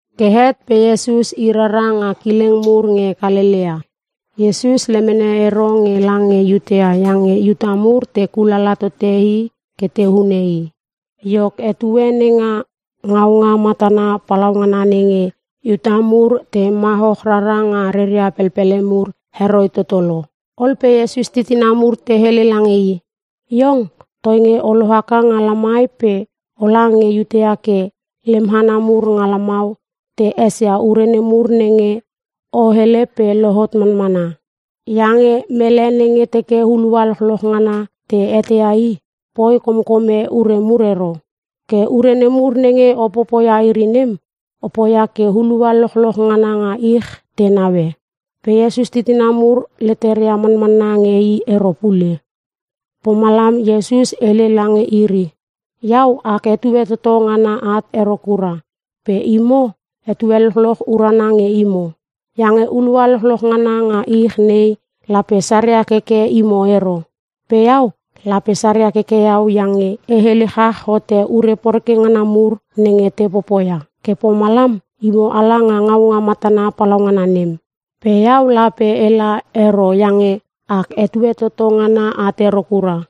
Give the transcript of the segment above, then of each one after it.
Ke het pe Iesus i rara nga kileng mur nge Kalelea. Iesus lemene ero nge lange Iutea iange Iuta mur te kulala tote i ke te hune i. Iok, etue nenga ngaunga matana palaugana nenge Iuta mur te mahoch rara nga reria pelpele mur, heroi toto lo. Ol pe Iesus titina mur te hele lange i, “Iong toinge o lohaka nga lamai pe ola nge Iutea ke lem hana mur nga lamau te esia ure nemur nenge o hele pe lohot manmana. Iange mele nenge teke hulua lochloch ngana te eteia i, poi komkome ure mur ero. Ke ure nemur nenge o popoia iri nem, o poia ke hulua lochloch ngana nga ich te naue.” Pe Iesus titina mur leteria manmanna nge i ero pule. Pomalam Iesus hele lange iri, “Iau, ak etue toto ngana at ero kura pe imo etue lochloch urana nge imo. Iange hulua lochloch ngana nga ich nei lape saria keke imo ero. Pe iau, lape saria keke iau iange e hele chach hote ure poreke ngana mur nenge te popoia. Ke pomalam, imo ala nga ngaunga matana palaungana nem. Pe iau lape ela ero iange ak etue toto ngana at ero kura.”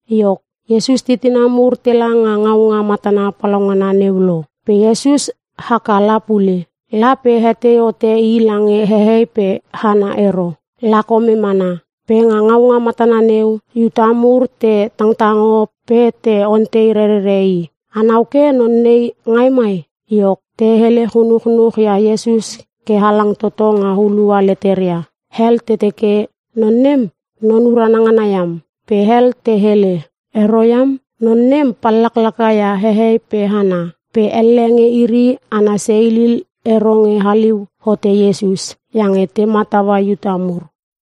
Iok, Iesus titina mur tela nga ngaunga matana palaungana neu lo. Pe Iesus haka la pule. La pe hetei hote i lange hehei pe hana ero. La kome mana. Pe nga ngaunga matana neu, Iuta mur te tangtango pe te ontei rerere i, “Anau ke non nei ngai mai?” Iok, te hele chunuchnuch ia Iesus ke halang toto nga hulua leteria. Hel te teke, “Non nem, non urana ngana iam.” Pe hel te hele, “Ero iam, non nem pallaklaka ia hehei pe hana.” Pe elle nge iri ana seilil ero nge haliu hote Iesus, iange te mataua Iuta mur.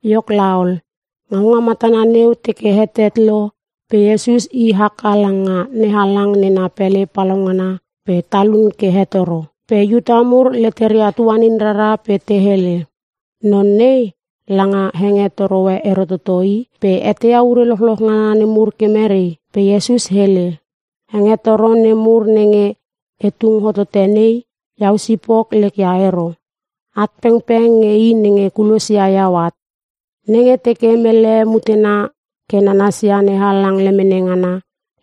Iok laol, ngaunga matana neu teke hetet lo pe Iesus i haka langa NeHalang nena pele palaungana pe talun ke hetoro. Pe Iuta mur leteria tuanin rara pe te hele, “Non nei langa hengetoro e ero toto i. Pe eteia ure lochloch ngana nemur ke merei?” Pe Iesus hele, “Hengetoro nemur nenge e tung hotote nei, iau sipok lek ia ero. At pengpeng nge i nenge kulosia iau at. Nenge teke mele mutena ke nanasia NeHalang lemene ngana,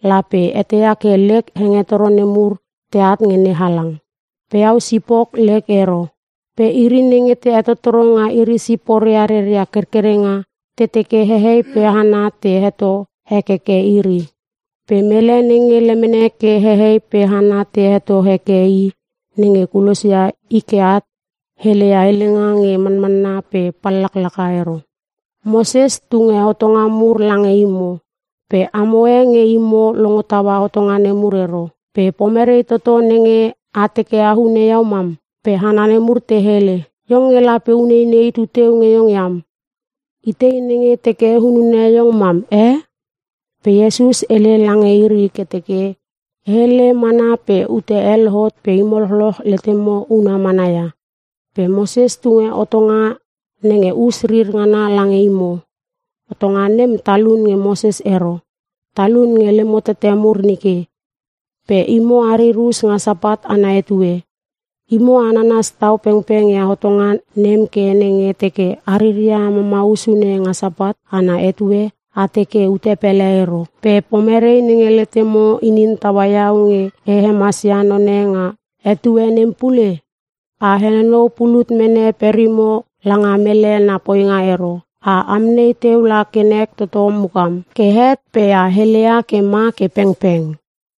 lape eteia ke lek hengetoro nemur teat nge NeHalang. Pe iau sipok lek ero. Pe iri nenge te hetottoro nga iri siporia reria kerkerenga, te teke hehei pe hana te heto hekeke iri. Pe mele nenge lemene ke hehei pe hana te heto heke i nenge kulosia i ke at, heleia helenga nge manmanna pe pallaklaka ero. Moses tunge hotonga mur lange imo. Pe amo e nge imo longo taua hotonga nemur ero. Pe pomerei toto nenge a teke a hune iau mam?” Pe hana nemur te hele, “Iong nge lape uneinei tuteu nge iong iam. Itei nenge teke hunune iong mam e?” Pe Iesus hele lange iri ke teke, “E hele mana pe ute e lohot pe imo lochloch letemo una mana ia. Pe Moses tunge hotonga nenga us rir ngana lange imo. (Hotonga nem talun nge Moses ero. Talun nge lemo tete mur nike.) Pe imo arir us nga Sapat ana etue. Imo a nanas tau pengpeng ia hotonga nem ke nenge teke a riria mamau sune nga Sapat ana etue, a teke ute pele ero. Pe pomerei nenge letemo inin taua iau nge e hemasia none nga etue nem pule? A henonou pulut mene perimo langa mele na poinga ero. A amnei teu la ke nek toto mukam. Ke het pe a heleia ke ma ke pengpeng.”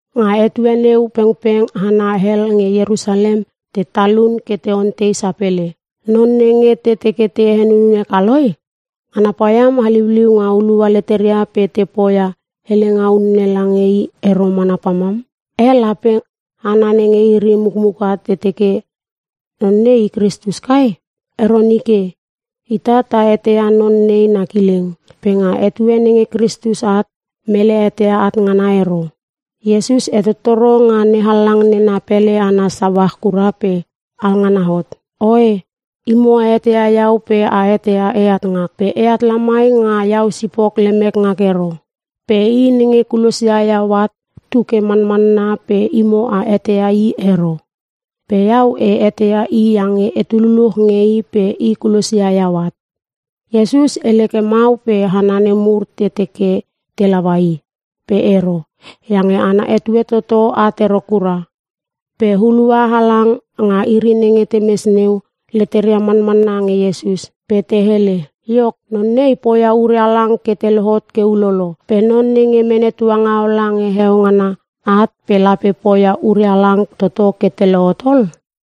Nga etue neu pengpeng hana hel nge Ierusalem te talun ke te ontei sapele, “Non nenge te teke te hunune kaloi? Ngana paiam haliuliu nga hulua leteria pe te poia helenga unne lange i ero mana pamam. Eh, lape hana nenge iri mukmuka te teke non nei i Kristus kai? Ero nike. Ita ta eteia non nei na kileng. Pe nga etue nenge Kristus at, mele eteia at ngana ero.” Iesus hetottoro nga NeHalang nena pele ana sauach kura pe alngana hot, “Oe, imo a eteia iau pe a eteia eat ngak. Pe eat lamai nga iau sipok lemek ngak ero. Pe i nenge kulosia iau at tu ke manmanna pe imo a eteia i ero. Pe iau e eteia i iange etu luluch nge i pe i kulosia iau at.” Iesus hele ke mau pe hana nemur te teke te laua i, pe ero. Iange ana etue toto at ero kura. Pe hulua halang nga iri nenge temes neu, leteria manmanna nge Iesus. Pe te hele, “Iok, non nei poia ure halang ke te lohot ke ulolo, pe non nenge mene tuangaola nge heo ngana at pe lape poia ure halang toto ke te lohot ol?”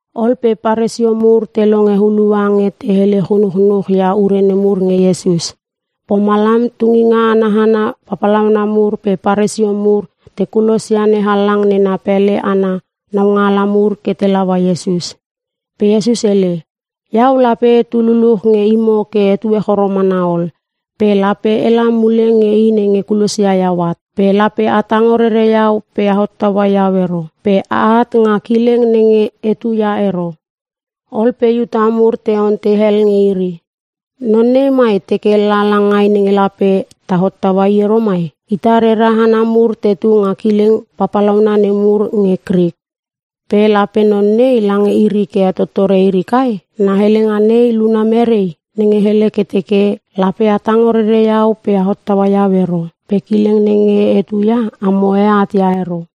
Ol pe Paresio mur te longe hulua nge te hele chunuchnuch ia ure nemur nge Iesus. Pomalam tunginga ana hana papalauna mur pe Paresio mur te kulosia NeHalang nena pele ana naungaala mur ke te laua Iesus. Pe Iesus hele, “Iau lape etu luluch nge imo ke etue choro mana ol pe lape ela mule nge i nenge kulosia iau at. Pe lape a tango rere iau pe a hottaua iau ero. Pe aat nga kileng nenge etu ia ero.” Ol pe Iuta mur te ontei hel nge iri, “Non nei mai teke la langai nenge lape ta hottaua i ero mai? Ita rera hana mur tetu nga kileng papalauna nemur nge Krik. Pe lape non nei lange iri ke hetottore iri kai? Na helenga nei luna merei? Nenge hele ke teke, ‘Lape a tango rere iau pe a hottaua iau ero. Pe kileng nenge etu ia, amo e at ia ero.’”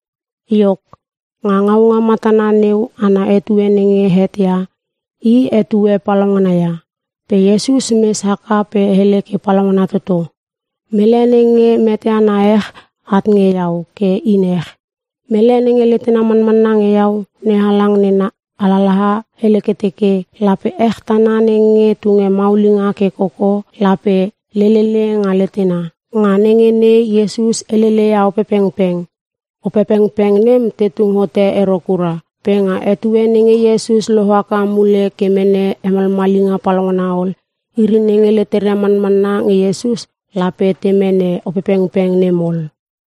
Iok, nga ngaunga matana neu ana etue nenge het ia, i etue palaungana ia. Pe Iesus mes haka pe hele ke palaungana toto, “Mele nenge meteana ech, at nge iau ke in ech. Mele nenge letena manmanna nge iau, NeHalang nena alalaha hele ke teke, ‘Lape ech tana nenge tunge maulinga ke koko lape lelele nga letena.’” Nga nenge nei Iesus helele ia Opepengpeng. Opepengpeng nem te tung hote ero kura. Pe nga etue nenge Iesus lohaka mule ke mene hemalmalinga palaungana ol, iri nenge leteria manmanna nge Iesus lape te mene Opepengpeng nem ol.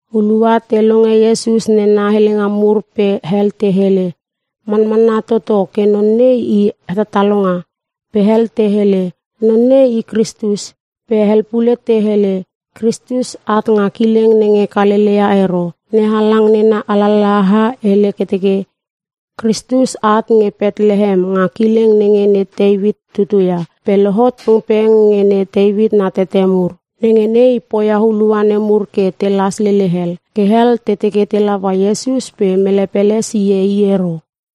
Hulua te longe Iesus nena helenga mur pe hel te hele, “Manmanna toto ke non nei i Hetatalonga.” Pe hel te hele, “Non nei, i Kristus.” Pe hel pule te hele, “Kristus at nga kileng nenge Kalelea ero. NeHalang nena alalaha hele ke teke, Kristus at nge Petlehem nga kileng nenge ne Teuit tutu ia. Pe lohot pengpeng nge ne Teuit na tete mur.” Nenge nei poia hulua nemur ke telas lele hel. Ke hel te teke te laua Iesus pe mele pele sie i ero.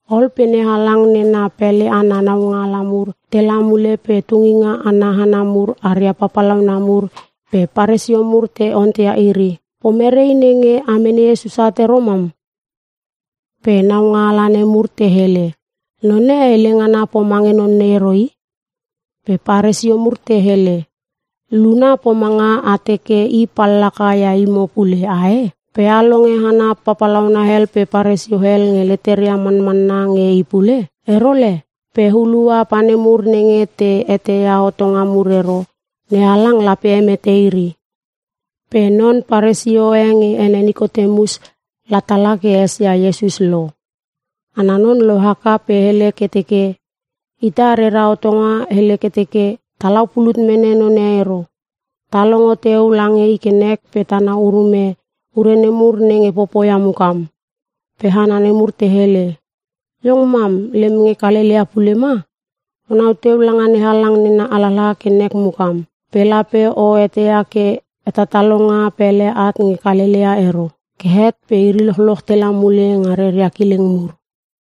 Ol pe NeHalang nena pele ana naungaala mur tela mule pe tunginga ana hana mur aria papalauna mur pe Paresio mur te onteia iri, “Pomerei nenge a mene Iesus at ero mam?” Pe naungaala nemur te hele, “Non e hele ngana pomange non nei ero i.” Pe Paresio mur te hele, “Luna pomanga a teke i pallaka ia imo pule. Ae? Pe a longe hana papalauna hel pe Paresio hel nge leteria manmanna nge i pule? Ero le. Pe hulua pa nemur nenge te eteia hotonga mur ero, NeHalang lape hemete iri.” Pe non Paresio e nge ene Nikotemus la tala ke esia Iesus lo. Ana non lohaka pe hele ke teke, “Ita rera hotonga hele ke teke talau pulut mene none ero. Ta longo teu lange i ke nek pe tanau urume ure nemur nenge popoia mukam.” Pe hana nemur te hele, “Iong mam lem nge Kalelea pule ma? Onau teu langa NeHalang nena alalaha ke nek mukam. Pe lape o eteia ke hetatalonga pele at nge Kalelea ero.” [ Ke het pe iri lochloch tela mule nga reria kileng mur.